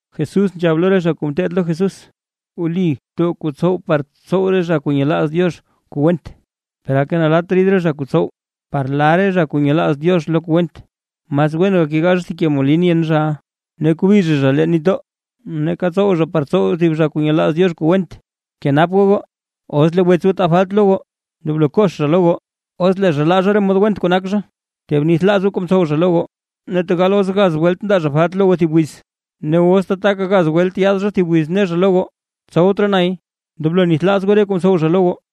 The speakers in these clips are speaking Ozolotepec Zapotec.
Jesús nzhab lo re zha kuu ngeteed lo Jesús: ―Wli too kuu tsow par tsow re zha kuu nyelaaz Diox kuu went: ¡Per aka nalatt rid re zha kuu tsow par la re zha kuu nyelaaz Diox lo kuu went! Mas wen gakegaa zha thib ke molin yen zha, ne kobi zha zha leen nitdoo, nake tsow zha par tsow thib re zha kuu nyelaaz Diox kuu went. ¡Kenap goo goo! Os lee wets goo taa falt lo goo, ndoblo kox zha lo goo, os lee zha laa zha re mod went kuu nak zha, tee bnithlaaz goo kuu mtsow zha lo goo. Ne tegal os gaz welt ndaa zha falt lo goo thib wiz, ne os tataka gaz welt yaad zha thib wiz ne zha lo goo: “Tsowt raa nay”, ndoblo nithlaaz goo re kuu mtsow zha lo goo.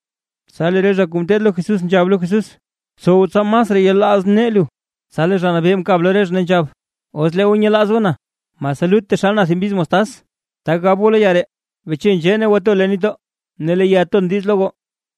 Tsa lee re zha kuu ngeteed lo Jesús nzhab lo Jesús: ―Btsow tsa masraa yelaaz nee lu. Tsa lee Zha Nabee mkab lo re zha, ne nzhab: ―Os lee goo nyelaaz goo na, mase lut taxal na thib mbiz mostaz, tak gab goo lo ya ree: “Beche nzhee ne to leen nitdoo”, ne lee ya ton diiz lo goo.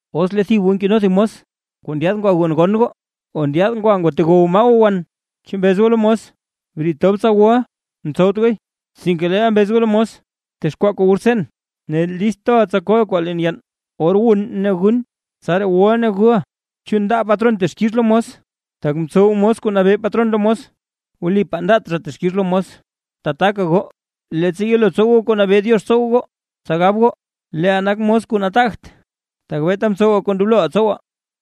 ’Os lee thib goo nkeno thib mos kuu ndyaad ngwa gonn gon gonn o ndyaad ngwatewoy maa wan, chu mbez goo lo mos: “Briid tob tsa wuʼa”. Ntsowt gooy, sinke leel mbez goo lo mos: “Btexkwaa kuu wu rtseen, ne list toʼa tsa koʼa kwaa leen yann, or wun ne gun. Tsaraa wuʼa ne guʼa.” ¿Chu ndaa patron texkix lo mos, tak mtsow mos kuu mnabee patron lo mos? Wlipaa ndaat zha texkix lo mos. Tataka goo, leettsa yelo tsow goo kuu nabee Diox tsow goo, tsa gab goo: “Leeʼaa nak mos kuu nataagt, tak beeta mtsowaa kuu ndobloʼaa tsowaa”.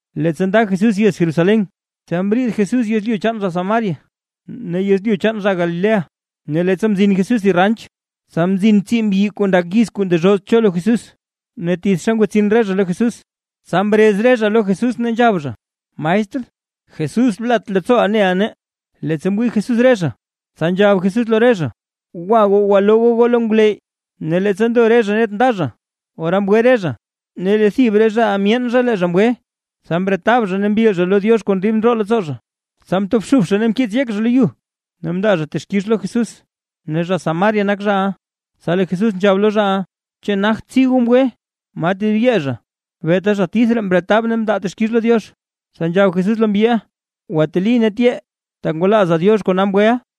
Leettsa nda Jesús yez Jerusalén, tsa mriid Jesús yezlyu chaan zha Samaria ne yezlyu chaan zha Galilea. Ne leettsa mzin Jesús thib ranch, tsa mzin tsii mbyi kuu ndak yiz kuu ndezhoz cho lo Jesús. Ne tithxa mrin re zha lo Jesús. Tsa mrez re zha lo Jesús, ne nzhab zha: ―¡Maestr! ¡Jesús! ¡Blat leettsooʼa neʼa nee! Leettsa mwii Jesús re zha; tsa nzhab Jesús lo re zha: ―Gwa goo, gwaloo goo goo lo ngwleyy. Ne leettsa ndo re zha net nda zha, ora mgwe re zha. Ne lee thib re zhaʼa myeen zha lee zha mgwe, tsa mretab zha ne mbil zha lo Diox kon dib ndroo leettsoo zha, tsa mtobxub zha ne mkiits zha yek zha lo yu, ne mndaa zha texkix lo Jesús. Ne zha Samaria nak zhaʼa. Tsa lee Jesús nzhab lo zhaʼa: ―¿Chu nagt tsii goo mgwe? ¿Ma tedib yee zha? Beeta zha tith ree mretab ne mndaa texkix lo Diox. Tsa nzhab Jesús lo mbyiʼa: ―Gwateli ne tyee. Tak ngwalaaza Diox kona mgweʼa.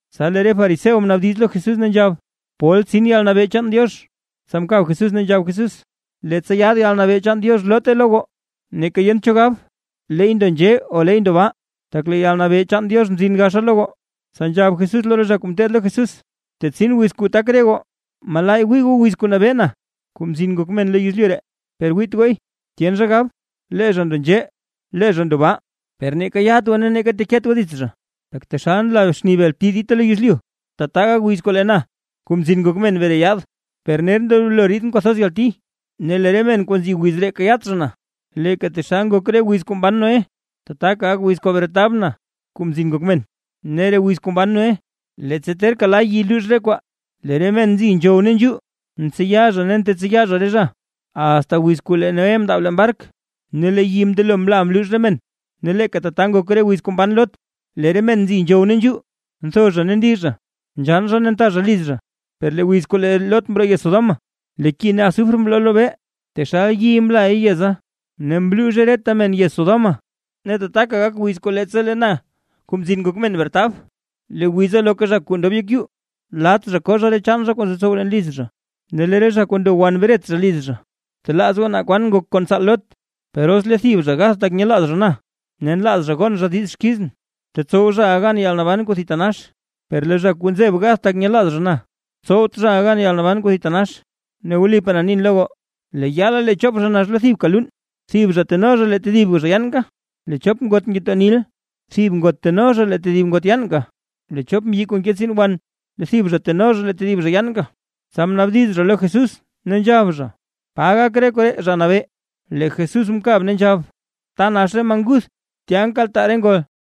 Tsa lee re fariseo mnaabdiz lo Jesús ne nzhab: ―¿Pol tsin yalnabee chaan Diox? Tsa mkab Jesús, ne nzhab Jesús: ―Leettsa yaad yalnabee chaan Diox, loote lo goo. Neeka yent cho gab: “¡Leey ndo nzhee! O ¡Leey ndo baa!” Tak lee yalnabee chaan Diox mzin gaxa lo goo. Tsa nzhab Jesús lo re zha kuu ngeteed lo Jesús: ―Tetsin wiz kuu tak re goo, malaay wii goo wiz kuu nabee na, Kuu Mzin Ngok Men lo yezlyu ree, per wiit gooy. Tyen zha gab: “Lee zha ndo nzhee, lee zha ndo baa”, per neeka yat goo ne neeka teket goo dits zha. Tak taxal nla xni bel bti dita lo yezlyu, tata gak wiz kuu lee na, Kuu Mzin Ngok Men bre yaad. Per ner ndoblo riidʼn kwathoz yalti, ne lee re men kuu nzi wiz ree kayaat zha na. Leeka taxal ngok re wiz kuu mban Noé, tataka gak wiz kuu bretab na, Kuu Mzin Ngok Men. Ne re wiz kuu mban Noé, leettsa terka la yi luux re kwaa, lee re men nzi nzhow ne nzhuu, ntseya zha ne ntetseya zha re zha, asta wiz kuu lee Noé mndaab leen bark, ne lee yi mndelo mla mluux re men. Ne leeka tata ngok re wiz kuu mban Lot, lee re men nzi nzhow ne nzhuu, ntho zha ne ndi zha, nzhann zha ne nta zha liz zha. Per lee wiz kuu lee Lot mroo yez Sodoma, lee ki ne azufre mroo lobee, ne taxal yi mlay yeza, ne mluuzhe reta men yez Sodoma. Ne tataka gak wiz kuu leettsa lee na, Kuu Mzin Ngok Men bretab. Lee wiza loka zha kuu ndob yek yuu, lat zha koo zha re chaan zha kuu nzotsow leen liz zha, ne lee re zha kuu ndo wan bret zha liz zha. ¡Btelaaz goo naa kwan ngok kon tsaal Lot! ’Per os lee thib zha gath zha tak nyelaaz zha na, ne nlaaz zha gon zha diiz xkizʼn, tetsow zhaʼa gan yalnaban kuu thitanax, per lee zha kuu nzeb gath zha tak nyelaaz zha na, tsowt zhaʼa gan yalnaban kuu thitanax. Ne wlipaa na nin lo goo, lee yaala lee chop zha nax lo thibka luun, thib zha teno zha lee tedib zha yaanka. Lee chop ngot ngetoo nil, thib ngot teno zha lee tedib ngot yaanka. Lee chop mbyi kuu nke tsiin wan; thib zha teno zha lee tedib zha yaanka. Tsa mnaabdiz zha lo Jesús, ne nzhab zha: ―¿Pa gak re koree, Zha Nabee? Lee Jesús mkab, ne nzhab: ―Ta nax re maa nguth, tya nkaltaa re ngol.